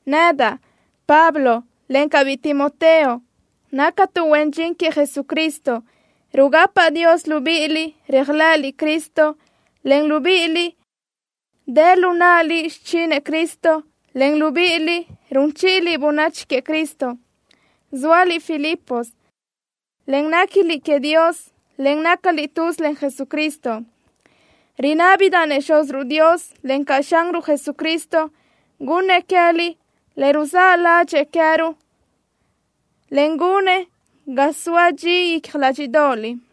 Nedaʼ, Pablo, encaʼ biʼi Timoteo, nactuʼ huen dxin queëʼ Jesucristo. Rugapaʼ Dios libíʼiliʼ, réajlëʼëliʼ Cristo, en libíʼiliʼ, dë lu náʼaliʼ xichinëʼ Cristo, en libíʼiliʼ, run chíʼiliʼ bönachi queëʼ Cristo. Zóaliʼ Filipos, en néquiliʼ queëʼ Dios, en nácaliʼ tuz len Jesucristo. Rinábidaʼ-nëʼ Xúziruʼ Dios, encaʼ Xanruʼ Jesucristo gunnëʼ queë́liʼ le ruzáʼ ládxëʼë queë́ruʼ, en gunëʼ ga soa dxi icja ládxiʼdoʼoliʼ.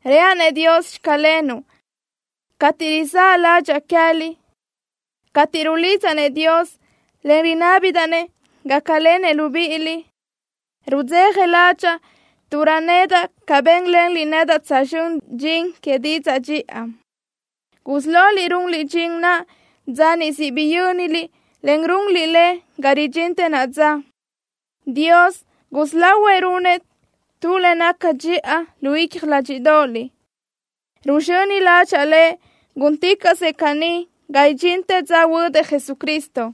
Reaʼ-nëʼ Dios: “Xclenuʼ”, cateʼ rizáʼ ládxaʼa queë́liʼ. Cateʼ rulidzaʼ-nëʼ Dios, en rinábidaʼ-nëʼ gácalenëʼ libíʼiliʼ, rudzeja ládxaʼa tuʼ röjnedaʼ ca bénlenliʼ nedaʼ tsözxö́n dxin que didzaʼ dxiʼa. Gusí loliʼ runliʼ dxin naʼ dza niʼ siʼ biyö́niliʼ, en runliʼ le ga ridxintë naʼa dza. Dios gusí lahuëʼ runëʼ tu le naca dxiʼa lu icja ládxiʼdoʼoliʼ. Ruzxöni ládxaʼa Lëʼ gúnticaʼsëʼ caní ga idxintë dza huödëʼ Jesucristo.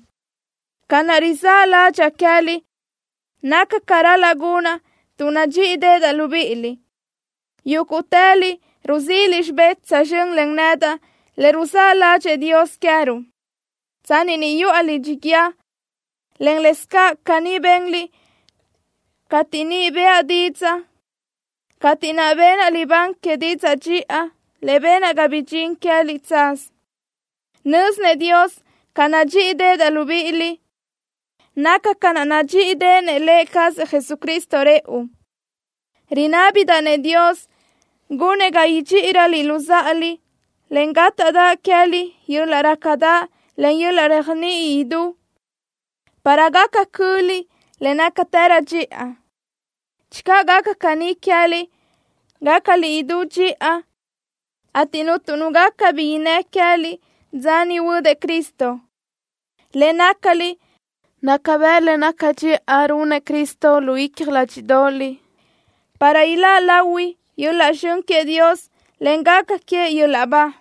Ca naʼ rizáʼ ládxaʼa queë́liʼ naca ca ral-laʼ gunaʼ tuʼ nadxíʼideʼedaʼ libíʼiliʼ. Yúguʼtëliʼ ruzíʼiliʼ xibé tsözxö́n len nedaʼ le ruzáʼ ládxëʼë Dios queë́ruʼ, tsanni ni yuʼa lidxi guíë, en lëscaʼ caní benliʼ cateʼ niʼ bëʼa didzaʼ, cateʼ naʼ benaʼ libán que didzaʼ dxiʼa le benaʼ ga bidxín queë́liʼ tsaz. Nö́zinëʼ Dios ca nadxíʼideʼedaʼ libíʼiliʼ. Naca ca naʼ nadxíʼideʼenëʼ Lë cazëʼ Jesucristo rëʼu. Rinábidaʼ-nëʼ Dios gunëʼ ga idxíʼiröliʼ luzáʼaliʼ, en gátaʼdaʼ queë́liʼ yöl-laʼ rácadaʼ, en yöl-laʼ réajniʼi idú para gaca cöliʼ le nácatërö dxiʼa. Channö gaca caní queë́liʼ, gácaliʼ idú dxiʼa, ateʼ cuntu nu gaca bi innë́ queë́liʼ dza niʼ huödëʼ Cristo. Le nácaliʼ naca bëʼ le naca dxiʼa runëʼ Cristo lu icja ládxiʼdoʼoliʼ para iláʼ lahui yöl-laʼ zxön queëʼ Dios, en gaca queëʼ yöl-laʼ ba.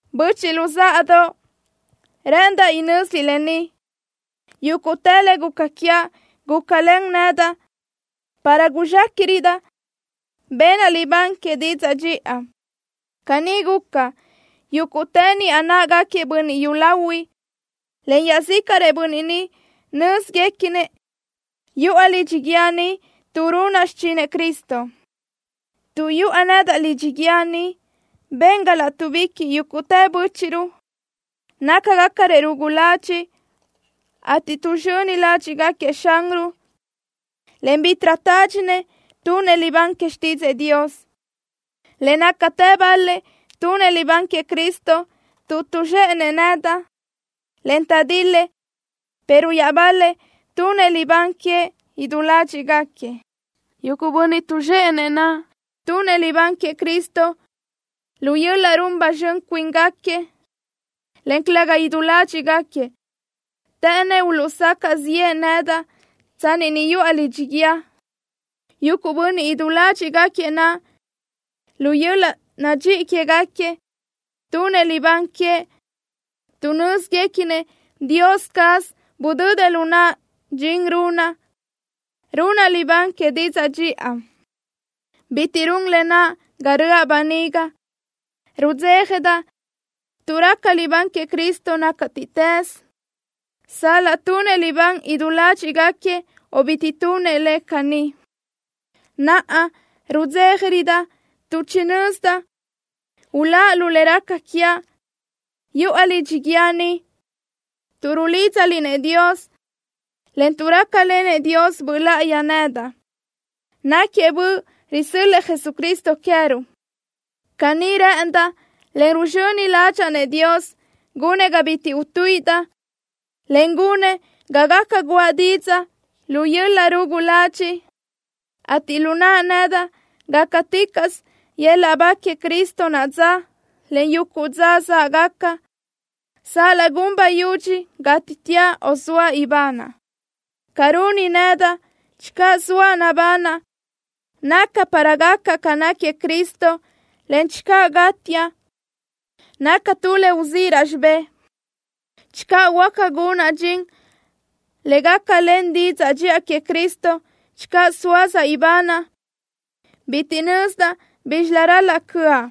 Böchiʼ luzáʼadoʼ, rë́ʼëndaʼ inö́ziliʼ lë ni: Yúguʼtë le guca quiaʼ gulácalen nedaʼ para guzxéquiʼrödaʼ benaʼ libán que didzaʼ dxiʼa. Caní guca, yúguʼtë niʼa náʼagaquiëʼ bönniʼ yúlahuiʼ, en iaʼzícaʼrëʼ bönniʼ ni nö́zguequinëʼ yuʼa lidxi guíë ni tuʼ runaʼ xichinëʼ Cristo. Tuʼ yuʼa nedaʼ lidxi guíë ni ben ga látuʼbiquiʼ yúguʼtë bö́chiʼruʼ nácagacarëʼ rugu ladxiʼ, ateʼ tuʼzxöni ládxiʼgaquiëʼ Xanruʼ, en bítiʼrö tádxinëʼ tunëʼ libán que xtídzëʼë Dios. Le nácatë bal-lëʼ tunëʼ libán queëʼ Cristo tuʼ tuʼzxéʼenëʼ nedaʼ, en taʼdil-lëʼ, pero iaʼbal-lëʼ tunëʼ libán queëʼ idú ládxiʼgaquiëʼ. Yuguʼ bönniʼ tuʼzxéʼenëʼ naʼ tunëʼ libán queëʼ Cristo lu yöl-laʼ run ba zxön cuíngaquiëʼ, en calëga idú ládxiʼgaquiëʼ. Të́ʼënnëʼ uluʼsacaʼ ziʼë nedaʼ tsanni ni yuʼa lidxi guíë. Yuguʼ bönniʼ idú ládxiʼgaquiëʼ naʼ, lu yöl-laʼ nadxíʼi quégaquiëʼ tunëʼ libán queëʼ, tuʼ nö́zguequinëʼ Dios caz budödëʼ lu naʼa dxin runaʼ, runaʼ libán que didzaʼ dxiʼa. Bitiʼ run lë naʼ ga röʼa böniga. Rudzéjadaʼ tuʼ raca libán queëʼ Cristo nácatiʼtës, sal-laʼ tunëʼ libán idú ládxiʼgaquiëʼ o bitiʼ tunëʼ le caní. Naʼa, rudzéjarödaʼ tuʼ chinö́zidaʼ uláʼ lu le raca quiaʼ, yuʼa lidxi guíë ni, tuʼ rulídzaliʼ-nëʼ Dios, en tuʼ rácalenëʼ Dios Böʼ Láʼayi nedaʼ. Náquiëʼ Böʼ risö́l-lëʼë Jesucristo queë́ruʼ. Caní rë́ʼëndaʼ, en ruzxöni ládxaʼa-nëʼ Dios, gunëʼ ga bitiʼ utuíʼidaʼ, en gunëʼ ga gaca guʼa didzaʼ lu yöl-laʼ rugu ladxiʼ, ateʼ lu naʼa nedaʼ gácaticaʼsö yöl-laʼ ba queëʼ Cristo naʼa dza, en yuguʼ dza záʼgaca, sal-laʼ gun bayudxi gátiteaʼ, o soaʼ ibanaʼ. Ca runi nedaʼ, channö zoaʼ nabanaʼ, naca para gacaʼ ca náquiëʼ Cristo, en channö gátiaʼ, naca tu le uzíʼiraʼ xibé. Channö huáca gunaʼ dxin le gácalen didzaʼ dxiʼa queëʼ Cristo channö sóasaʼ ibanaʼ, bitiʼ nözdaʼ bízxilö ral-laʼ cö́aʼ.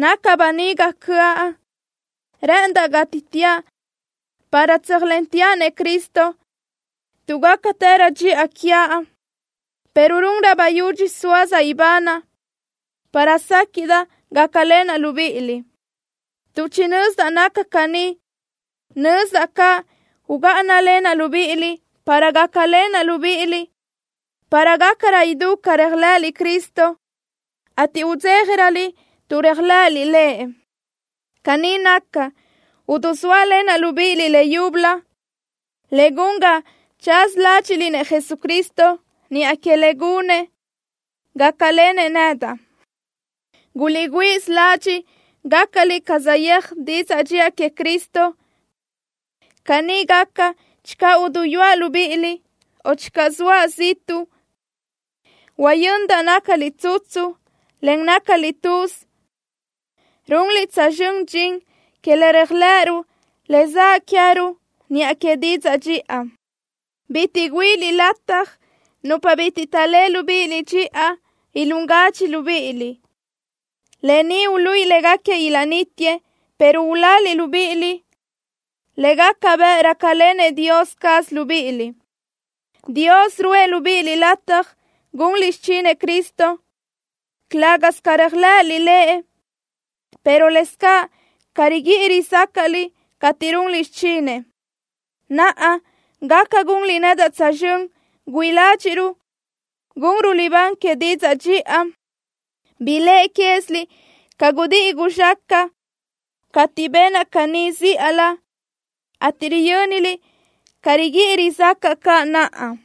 Naca böniga cö́aʼ. Rë́ʼëndaʼ gátiteaʼ para tsöjsóalenteaʼ-nëʼ Cristo, tuʼ gácatërö dxiʼa quiaʼ, pero runrö bayudxi sóasaʼ ibanaʼ para séquiʼdaʼ gácalenaʼ libíʼiliʼ. Tuʼ chinö́zidaʼ naca caní, nözdaʼ caʼ ugáʼanalenaʼ libíʼiliʼ para gácalenaʼ libíʼiliʼ para gácarö idú ca réajlëʼëliʼ Cristo, ateʼ udzéjaröliʼ tuʼ réajlëʼëliʼ Lëʼ. Caní naca, udusóalenaʼ libíʼiliʼ leyúbölö, le gun ga tsaz ládxiʼliʼ-nëʼ Jesucristo niʼa que le gunëʼ, gácalenëʼ nedaʼ. Guliʼgüíʼsö ladxiʼ gácaliʼ ca saʼyéaj didzaʼ dxiʼa queëʼ Cristo. Caní gaca, channö uduyúaʼ libíʼiliʼ o channö soaʼ ziʼtuʼ, huayö́nidaʼ nácaliʼ tsutsu, en nácaliʼ tuz, runliʼ tsözxö́n dxin que le réajlëʼëruʼ le zaʼ queë́ruʼ niʼa que didzaʼ dxiʼa. Bitiʼ güíʼiliʼ nupa bitiʼ taʼléʼe libíʼiliʼ dxiʼa lataj ilún gadxi libíʼiliʼ. Lë ni uluíʼi légaquiëʼ ilaʼnítiëʼ, pero uláliʼ libíʼiliʼ, le gaca bëʼ rácalenëʼ Dios caz libíʼiliʼ. Dios ruʼë libíʼiliʼ lataj gunliʼ xichinëʼ Cristo, calë́gasö ca réajlëʼëliʼ Lëʼ, pero lëscaʼ ca riguíʼi rizácaʼliʼ cateʼ runliʼ xichinëʼ. Naʼa, gaca gunliʼ nedaʼ tsözxö́n güíʼi ládxiʼruʼ gunruʼ libán que didzaʼ dxiʼa. Biléʼe quéziliʼ ca gudíʼi guzxácaʼa cateʼ benaʼ caní zíʼalö, ateʼ riyö́niliʼ ca riguíʼi rizácaʼa caʼ naʼa.